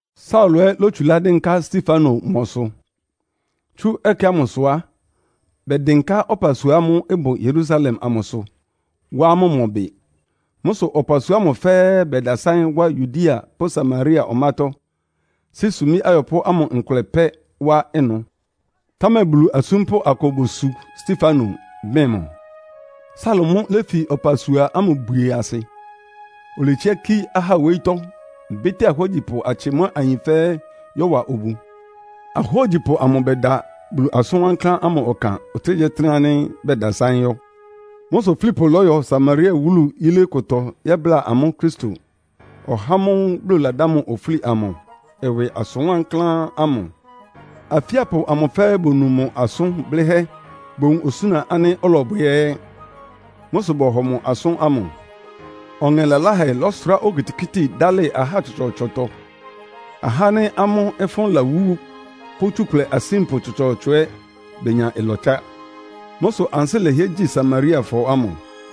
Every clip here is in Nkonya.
Saulo ɛ́ lótsulá dɩ́nká Stefano mɔsʋ. Tsú ɛkɛ ámʋsʋ á, bɛdɩnká ɔpasua ámʋ́ʋ́ ɩbʋ Yerusalem amʋsʋ, wá amʋ́ mɔ bɩ. Mʋ́ sʋ ɔpasua ámʋ fɛ́ɛ́ bɛdasáɩ́n wá Yudea pʋ́ Samaria ɔmátɔ́, sí sumbí ayɔpʋ́ ámʋ nkʋlɛ pɛ́ wá ɩnʋ. Támɛ Bulu asúmpʋ́ akʋ bosu Stefano, bɩn mʋ. Saulo mʋ́ léfi ɔpasua ámʋ bwie asɩ. Oletsiá kí ahá wóyítɔ́, bɩ́tɩ́a ahógyipʋ atsɩ mʋ́a ayin fɛ́ɛ́ yɔ́wa obu. Ahógyipʋ amʋ bɛda Bulu asʋn wankláán ámʋ ɔkan ɔtɩ́nɛgyíɔtɩ́nɛ́ ánɩ́ bɛdasáɩ́n yɔ́. Mʋ́ sʋ Filipo lɔ́yɔ Samaria wúlu yilé kʋtɔ yɛ́bláa amʋ́ Kristo, (ɔhá ámʋ́ʋ́ Bulu ladá mʋ ofúli amʋ) ɩwɩ asʋn wankláán ámʋ. Afíapʋ amʋ fɛ́ɛ́ bonu mʋ asʋn blɩ́hɛ́, bowun osúna ánɩ́ ɔlɔbwɛ ɛ́. Mʋ́ sʋ bɔhɔ mʋ asʋ́n ámʋ. Ɔŋɛ laláhɛ lɔ́sʋrá okitikíti dálɩ ahá tsɔtsɔɔtsɔtɔ. Ahá ánɩ́ amʋ́ ɩfʋ́n lawú pʋ́ tsukʋlɛ asínpʋ tsɔtsɔɔtsɔ ɛ́ benya ɩlɔtsá. Mʋ́ sʋ ansɩ́ lɛhɩɛ gyi Samariafɔ ámʋ.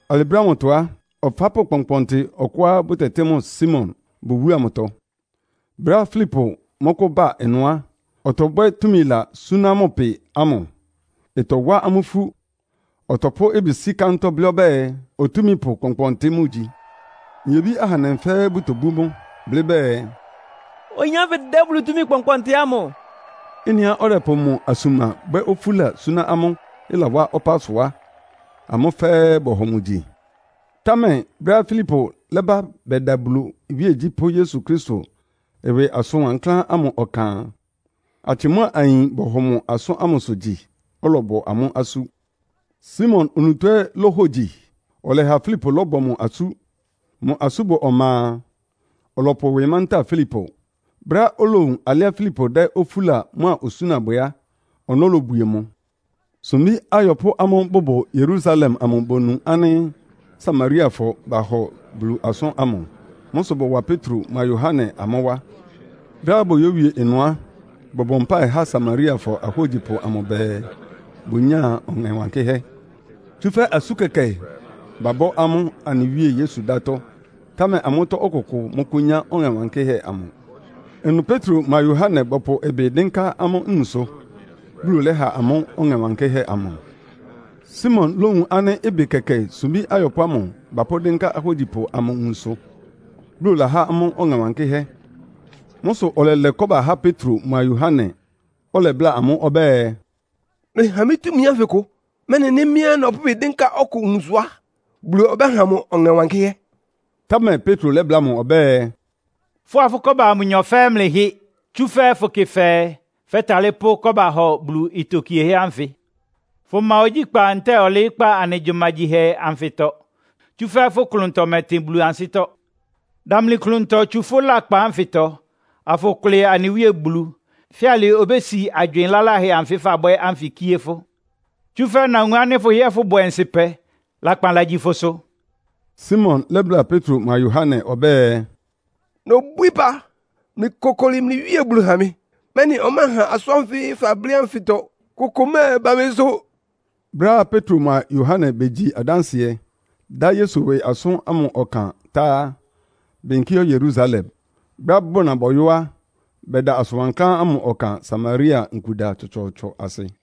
Alɩ brɛ́ ámʋtɔ á, ɔfápʋ́ kpɔnkpɔntɩ ɔkʋá bʋtɛtɩ́ mʋ Simon bʋ wúlu amʋtɔ. Brɛ́á Filipo mɔ́kʋ́ba ɩnʋ á, ɔtɔbwɛ́ túmila súná mʋ pɩ amʋ, ɩtɔwá amʋ́ ifú. Ɔtɔpʋ́ ɩbɩ sí kántɔ́ blɩ́ ɔbɛ́ɛ, otúmípʋ kpɔnkpɔntɩ mʋgyi. Nyebí ahandɛ fɛ́ɛ́ bʋtobú mʋ, blɩ́ bɛɛ, “Oyin ánfɩ dɛ́ Bulu túmi kpɔnkpɔntɩ ámʋ.” Ɩ́nɩá ɔdɛpʋ mʋ asuma bwɛ́ ofúla suná amʋ́, ɩlawá ɔpá sʋ á, amʋ́ fɛ́ɛ́ bɔhɔ mʋ gyi. Támɛ brɛ́á Filipo lɛ́ba bɛda Bulu iwíegyí pʋ́ Yesu Kristo ɩwɩ asʋn wankláán ámʋ ɔkan a, atsɩ mʋ́a ayin bɔhɔ mʋ asʋ́n ámʋsʋ gyi, ɔlɔbɔ amʋ́ asú. Simon onutó ɛ́ lóhogyi, ɔlɛha Filipo lɔ́bɔ mʋ asú. Mʋ asúbɔ ɔma a, ɔlɔpʋ ɩwɩ mantáa Filipo. Brɛ́á olowun alɩá Filipo dɛ́ ofúla mʋ́a osúna bwɛ á, ɔnɔ́ lobwie mʋ. Sumbí ayɔpʋ́ ámʋ́ʋ́ bʋbʋ Yerusalem amʋ bonu ánɩ́ Samariafɔ bahɔ Bulu asʋ́n ámʋ. Mʋ́ sʋ bɔwa Petro mʋa Yohane amʋ́ wá. Brɛ́á boyówie ɩnʋ á, bɔbɔ mpáɩ há Samariafɔ ahógyipʋ amʋ bɛɛ, bʋnyáa Ɔŋɛ Wankɩ́hɛ́. Tsúfɛ́ asú kɛkɛ babɔ́ amʋ́ anɩ Wíe Yesu dátɔ́, támɛ amʋ́tɔ́ ɔkʋkʋ mɔ́kʋ́nyá Ɔŋɛ Wankɩ́hɛ́ amʋ. Ɩnʋ Petro mʋa Yohane bɔpʋ ɩbɩ dɩ́nká amʋ́ nwunsʋ, Bulu lɛ́ha amʋ́ Ɔŋɛ Wankɩ́hɛ́ amʋ. Simon lówun ánɩ́ ɩbɩ kɛkɛ sumbí ayɔpʋ́ amʋ bapʋ́ dɩ́nká ahógyipʋ amʋ nwunsʋ, Bulu lahá amʋ́ Ɔŋɛ Wankɩ́hɛ́. Mʋ́ sʋ ɔlɛlɛ kɔ́ba há Petro mʋa Yohane, ɔlɛbláa amʋ́ ɔbɛ́ɛ, “Mlɩha mɩ́ túmi ánfɩ kʋ, mɛ́nɩ nɩ́ mɩ́ ɛ́ nɔpʋ́ ɩbɩ dɩ́nká ɔkʋ nwunsʋ á, Bulu ɔbɛ́ha mʋ Ɔŋɛ Wankɩ́hɛ́.” Támɛ Petro lɛ́bláa mʋ ɔbɛ́ɛ, “Fʋ́a fʋ́ kɔ́ba ámʋ nyɔ fɛ́ɛ́ mlɩhɩ. Tsúfɛ́ fʋkɩ fɛɛ, fɛ́talɩ́ pʋ́ kɔ́ba hɔ Bulu itokiehɛ́ ánfɩ. Fʋma ogyíkpá ntɛ́ɛ ɔlɩɩ́kpá anɩ gyumagyihɛ anfɩtɔ, tsúfɛ́ fʋ́ klʋntɔ mɛtɩn Bulu ansɩ́tɔ́. Damli klʋntɔ tsu fʋ́ lakpan ánfɩtɔ, afʋkʋlɩ anɩ Wíe Bulu. Fíalɩ obési agywɩɩn laláhɛ anfɩ́ fabwɛ́ ánfɩ kíé fʋ́. Tsúfɛ́ nawun ánɩ́ fʋhɩ́ɛ́ fʋ́bʋ ɔnsɩpɛ, lakpan lagyi fʋsʋ.” Simon lɛ́bláa Petro mʋa Yohane ɔbɛ́ɛ, “Nobwíí ɩpa, mlɩkokoli mlɩ Wíe Bulu ha mɩ, mɛ́nɩ ɔmɛ́ɛha asʋ́n ánfɩ fablɩ́ ánfɩtɔ kʋkʋ mɛ́ɛba mɩsʋ.” Brɛ́á Petro mʋa Yohane begyi adánsɩɛ, dá Yesu ɩwɩ asʋ́n ámʋ ɔkan tá á, beyinkí yɔ́ Yerusalem. Brɛ́á bʋna bɔyɔ́ á, bɛda asʋn wankláán ámʋ ɔkan Samaria nkuda tsɔtsɔɔtsɔ asɩ.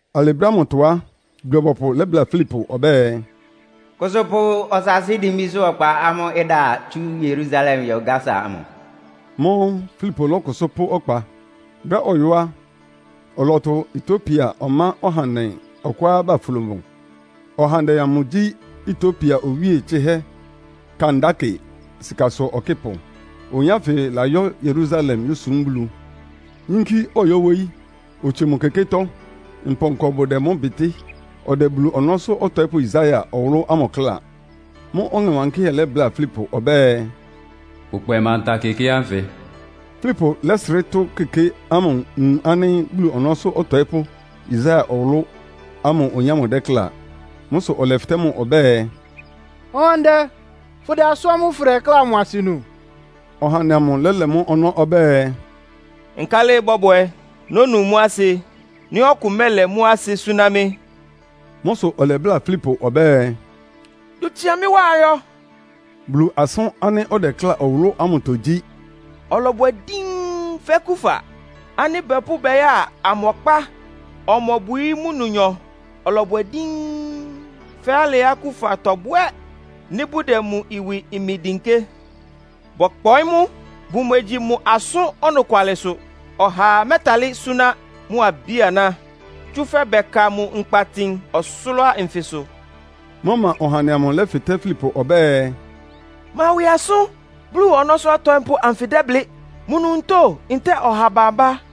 Alɩ brɛ́ ámʋtɔ á, Bulu-ɔbɔpʋ lɛ́bláa Filipo ɔbɛ́ɛ, “Kʋsʋ pʋ ɔsaasɩ́ dimbísʋ́ ɔkpa ámʋ́ʋ́ ɩda tsu Yerusalem ɩyɔ́ Gasa amʋ.” Mʋ́ʋ́ Filipo lɔ́kʋsʋ́ pʋ́ ɔkpa. Brɛ́á ɔyɔ́ á, ɔlɔtʋ Etiopia ɔmá ɔhandɛ ɔkʋá baflo mʋ. Ɔhandɛ amʋ gyí Etiopia owíe tsɩhɛ́ Kandake sikasʋ ɔkɩ́pʋ. Oyin ánfɩ layɔ́ Yerusalem yósum Bulu, yínkí ɔyɔ́ wóyí, otsie mʋ kekétɔ́, mpɔnkɔ bʋdɛ mʋ bɩtɩ́. Ɔdɛ Bulu ɔnɔ́sʋ́ ɔtɔɩ́pʋ́ Yesaia ɔwʋlʋ́ ámʋ kláa. Mʋ́ʋ́ Ɔŋɛ Wankɩ́hɛ́ lɛ́bláa Filipo ɔbɛ́ɛ, “Kpʋkpɛ manta keké ánfɩ.” Filipo lɛ́srɩ́ tʋ́ keké ámʋ wun ánɩ́ Bulu ɔnɔ́sʋ́ ɔtɔɩ́pʋ́ Yesaia ɔwʋlʋ́ ámʋ oyin ámʋ dɛ́ kláa. Mʋ́ sʋ ɔlɛfɩtɛ́ mʋ ɔbɛ́ɛ, “Ɔhandɛ, fʋdɛ asʋ́n ámʋ́ʋ́ fʋdɛkláa amʋ asɩ nu?” Ɔhandɛ amʋ lɛ́lɛ mʋ́ ɔnɔ́ ɔbɛ́ɛ, “Nkálɩ ɩbɔ́bwɛ nónu mʋ́ asɩ nɩ́ ɔkʋ mɛ́lɛ mʋ́ asɩ súná mɩ́?” Mʋ́ sʋ ɔlɛbláa Filipo ɔbɛ́ɛ, “Dʋ tsia mɩ́ wá ayɔ.” Bulu asʋ́n ánɩ́ ɔdɛkláa ɔwʋlʋ́ ámʋtɔ gyí: “Ɔlɔbwɛ díín fɛ́ kufa ánɩ́ bapʋ́ bɛya ɔmɔkpá. Ɔmobwií mʋ nnonyɔ. Ɔlɔbwɛ díín fɛ́ alɩá kufa tɔbwɛ́ nɩ́ bʋdɛ mʋ ɩwɩ imi dɩnkɩ́. Bɔkpɔɩ́ mʋ, bʋmegyi mʋ asʋ́n ɔnɔkwalɩsʋ. Ɔhaa mɛ́ɛtalɩ́ súná mʋ abí-aná, tsúfɛ́ bɛka mʋ nkpa tin ɔsʋlʋ́ʋ anfɩsʋ.” Mʋ́ʋ́ ɔmá ɔhandɛ amʋ lɛ́fɩtɛ́ Filipo ɔbɛ́ɛ, “Ma ɩwɩ asʋ́n Bulu ɔnɔ́sʋ́ ɔtɔɩ́pʋ́ anfɩ dɛ́blɩ́, mʋ onutó ntɛ́ɛ ɔha bambá?”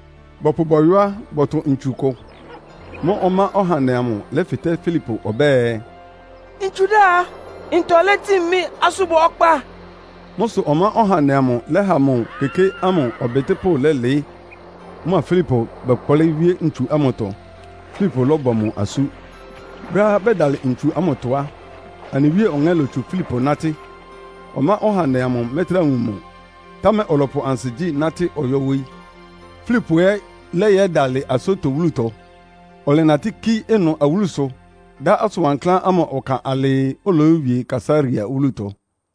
Bɔpʋ bɔyɔ́ á, bɔtʋ ntsu kʋ. Mʋ́ʋ́ ɔmá ɔhandɛ amʋ lɛ́fɩtɛ́ Filipo ɔbɛ́ɛ, “Ntsu dá a, ntɔ létin mɩ́ asúbɔ ɔkpa?” Mʋ́ sʋ ɔmá ɔhandɛ amʋ lɛ́ha mʋ keké ámʋ ɔbɩtɩ́pʋ́ lɛ́lɩɩ́. Mʋa Filipo bɛkplɩ́ wíé ntsu ámʋtɔ, Filipo lɔ́bɔ mʋ asú. Brɛ́á bɛdalɩ ntsu ámʋtɔ á, anɩ Wíe Ɔŋɛ́ lotsu Filipo nátɩ́. Ɔmá ɔhandɛ amʋ mɛ́trá wun mʋ, támɛ ɔlɔpʋ ansigyí natɩ́ ɔyɔ́ wóyí. Filipo ɛ́ lɛ́yɛdalɩ Asoto wúlutɔ. Ɔlɛnatɩ́ kí ɩnʋ awúlusʋ dá asʋn wankláán ámʋ ɔkan alɩɩ, oloyówie Kaesarea wúlutɔ.